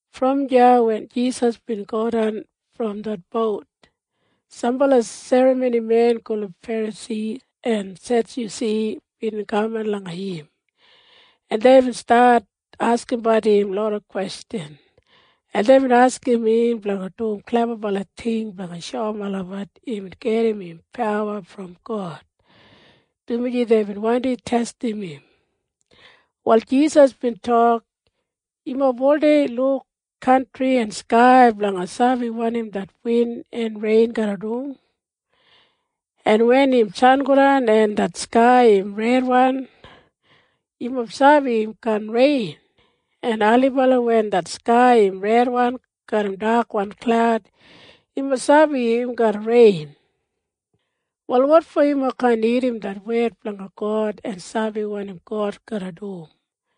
Brom deya wen Jisas bin godan brom det bout, sambala serramonimen gulum Ferasi en Sedyusi bin kaman langa im, en deibin stat askimbat im loda kwestjan, en deibin askim im blanga dum klebabala ting blanga shoum olabat imbin gedim im pawa brom God, dumaji deibin wandi testim im. Wal Jisas bin tok, “Yumob oldei luk kantri en skai blanga sabi wanim det win en rein garra dum. En wen im sangodan en det skai im redwan, yumob sabi im kaan rein. En ailibala wen det skai im redwan garram dakwan klaud, yumob sabi im garra rein. Wal wotfo yumob kaan irrim det wed blanga God en sabi wanim God garra dum?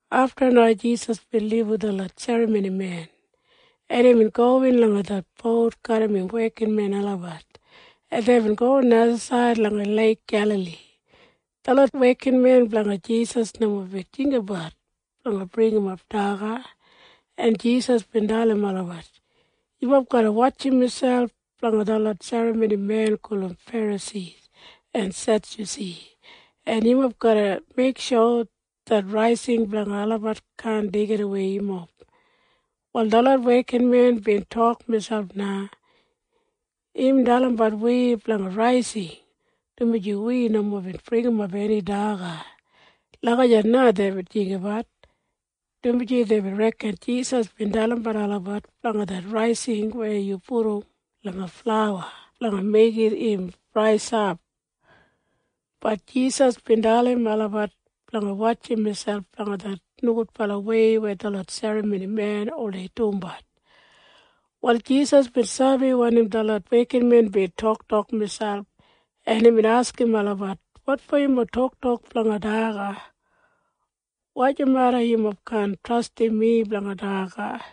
Afta na Jisas bin libum detlot serramonimen, en imbin gowin langa det bout garram im wekinmen olabat, en deibin go najasaid langa Leik Gelali. Detlot wekinmen blanga Jisas nomo bin jinggabat blanga bringimap daga, en Jisas bin dalim olabat, “Yumob garra wotjim miselp blanga detlot serramonimen gulum Ferasi en Sedyusi, en yumob garra meiksho det raising blanga olabat kaan deigidawei yumob.” Wal detlot wekinmen bin tok miselp na, “Im dalimbat wi blanga raising dumaji wi nomo bin bringimap eni daga.” Lagijat na deibin jinggabat, dumaji deibin reken Jisas bin dalimbat olabat blanga det raising weya yu pudum langa flauwa blanga meigim im raisap. Bat Jisas bin dalim olabat blanga wotjim miselp blanga det nogudbalawei weya detlot serramonimen oldei dumbat. Wal Jisas bin sabi wanim detlot wekinmen bin toktokbat, en imbin askim olabat, “Wotfo yumob toktok blanga daga? Wojameda yumob kaan trastim mi blanga daga?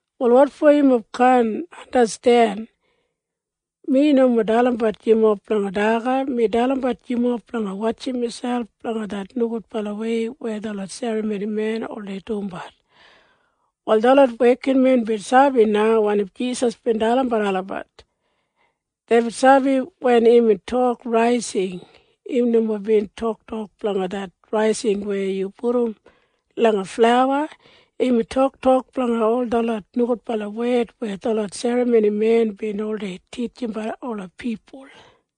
Wal wotfo yumob kaan sabi? Mi nomo dalimbat yumob blanga daga. Mi dalimbat yumob blanga wotjim miselp blanga det nogudbalawei weya detlot serramonimen oldei dumbat!” Wal detlot wekinmen bin sabi na wanim Jisas bin dalimbat olabat. Deibin sabi wen imbin tok raising, im nomo bin toktok blanga det raising weya yu pudum langa flauwa. Imbin toktok blanga ol detlot nogudbala wed weya detlot serramonimen bin oldei titjimbat ola pipul.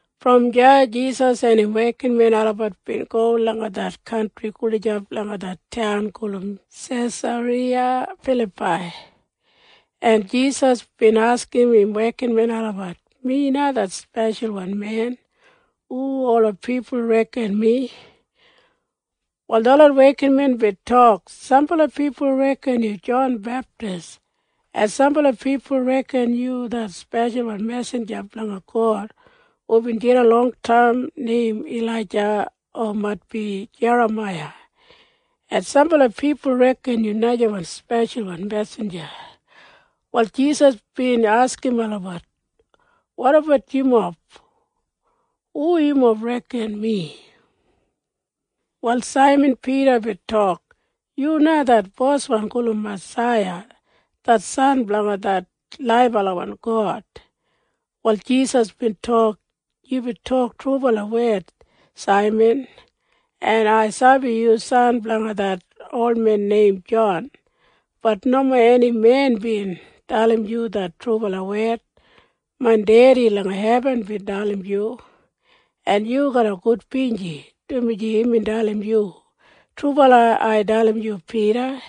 Brom deya Jisas en im wekinmen olabat bin go langa det kantri gulijap langa det taun gulum Sesariya Filapai, en Jisas bin askim im wekinmen olabat, “Mi na det Speshalwan Men. Hu ola pipul reken mi?” Wal detlot wekinmen bin tok, “Sambala pipul reken yu Jon Beptis, en sambala pipul reken yu det speshalwan mesinja blanga God hubin jidan longtaim neim Ilaija o maitbi Jeramaiya, en sambala pipul reken yu najawan speshalwan mesinja.” Wal Jisas bin askim olabat, “Wotabat yumob? Hu yumob reken mi?” Wal Saiman Pida bin tok, “Yu na det Boswan gulum Masaiya det San blanga det laibalawan God.” Wal Jisas bin tok, “Yubin tok trubala wed, Saiman. En ai sabi yu san blanga det olmen neim Jon. Bat nomo eni men bin dalim yu det trubala wed. Main Dedi langa hebin bin dalim yu. En yu garra gudbinji, dumaji imbin dalim yu. Trubala ai dalim yu, Pida.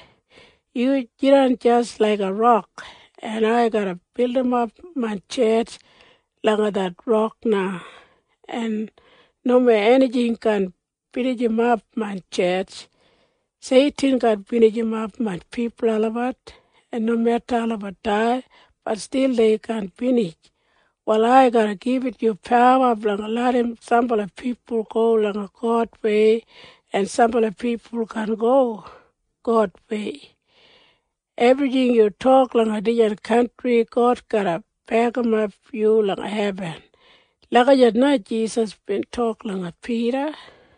Yu jidan jis laiga rok, en ai garra bildimap main tjetj langa det rok na, en nomo enijing kaan binijimap main tjetj. Seitin kaan binijimap main pipul olabat. En nomeda olabat dai, bat stil dei kaan binij. Wal ai garra gibit yu pawa blanga larram sambala pipul go langa Godwei en sambala pipul kaan go Godwei. Ebrijing yu tok langa dijan kantri God garra bekimap yu langa hebin.” Lagijat na Jisas bin tok langa Pida.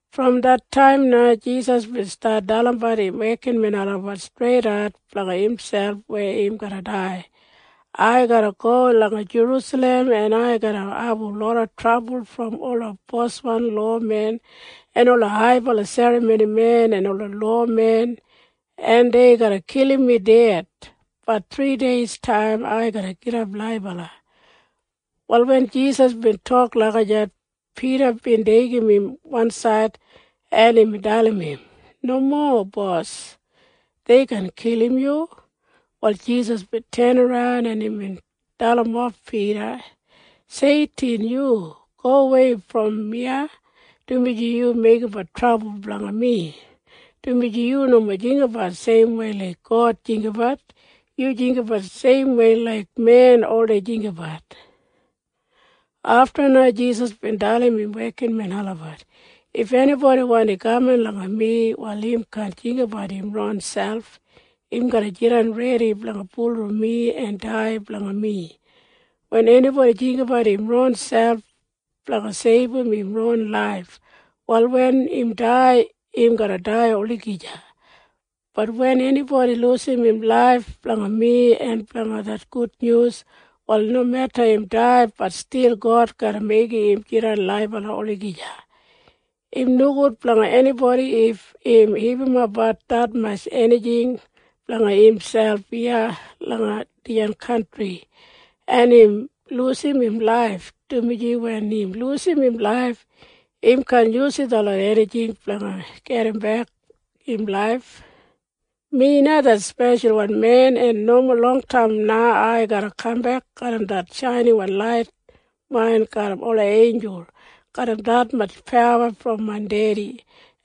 Brom det taim na Jisas bin stat dalimbat im wekinmen olabat streidat blanga imselp weya im garra dai, “Ai garra go langa Jerusalem, en ai garra abum loda trabul brom ola boswan olmen en ola haibala serramonimen en ola lowamen, en dei garra kilim mi ded. Bat thrideistaim ai garra gidap laibala.” Wal wen Jisas bin tok lagijat, Pida bin deigim im wansaid, en imbin dalim im, “Nomo, Bos! Dei kaan kilim yu!” Wal Jisas bin tenaran, en imbin dalimof Pida, “Seitin, yu gowei brom iya, dumaji yu meigimbat trabul blanga mi, dumaji yu nomo jinggabat seimwei laik God jinggabat. Yu jinggabat seimwei laik men oldei jinggabat.” Afta na Jisas bin dalim im wekinmen olabat, “If enibodi wandi kaman langa mi, wal im kaan jinggabat im ronselp. Im garra jidan redi blanga bulurrum mi en dai blanga mi. Wen enibodi jinggabat im ronselp blanga seibum im ron laif, wal wen im dai, im garra dai olagija. Bat wen enibodi lujim im laif blanga mi en blanga det gudnyus, wal nomeda im dai, bat stil God garra meigim im jidan laibala olagija. Im nogud blanga enibodi if im hipimapbat detmatj enijing blanga imselp iya langa dijan kantri, en im lujim im laif, dumaji wen im lujim im laif, im kaan yusum detlot enijing blanga gedimbek im laif. Mi na det Speshalwan Men, en nomo longtaim na ai garra kambek garram det shainiwan lait main garram ola einjul garram detmatj pawa brom main Dedi,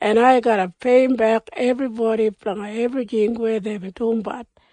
en ai garra peiyimbek ebribodi blanga ebrijing weya deibin dumbat.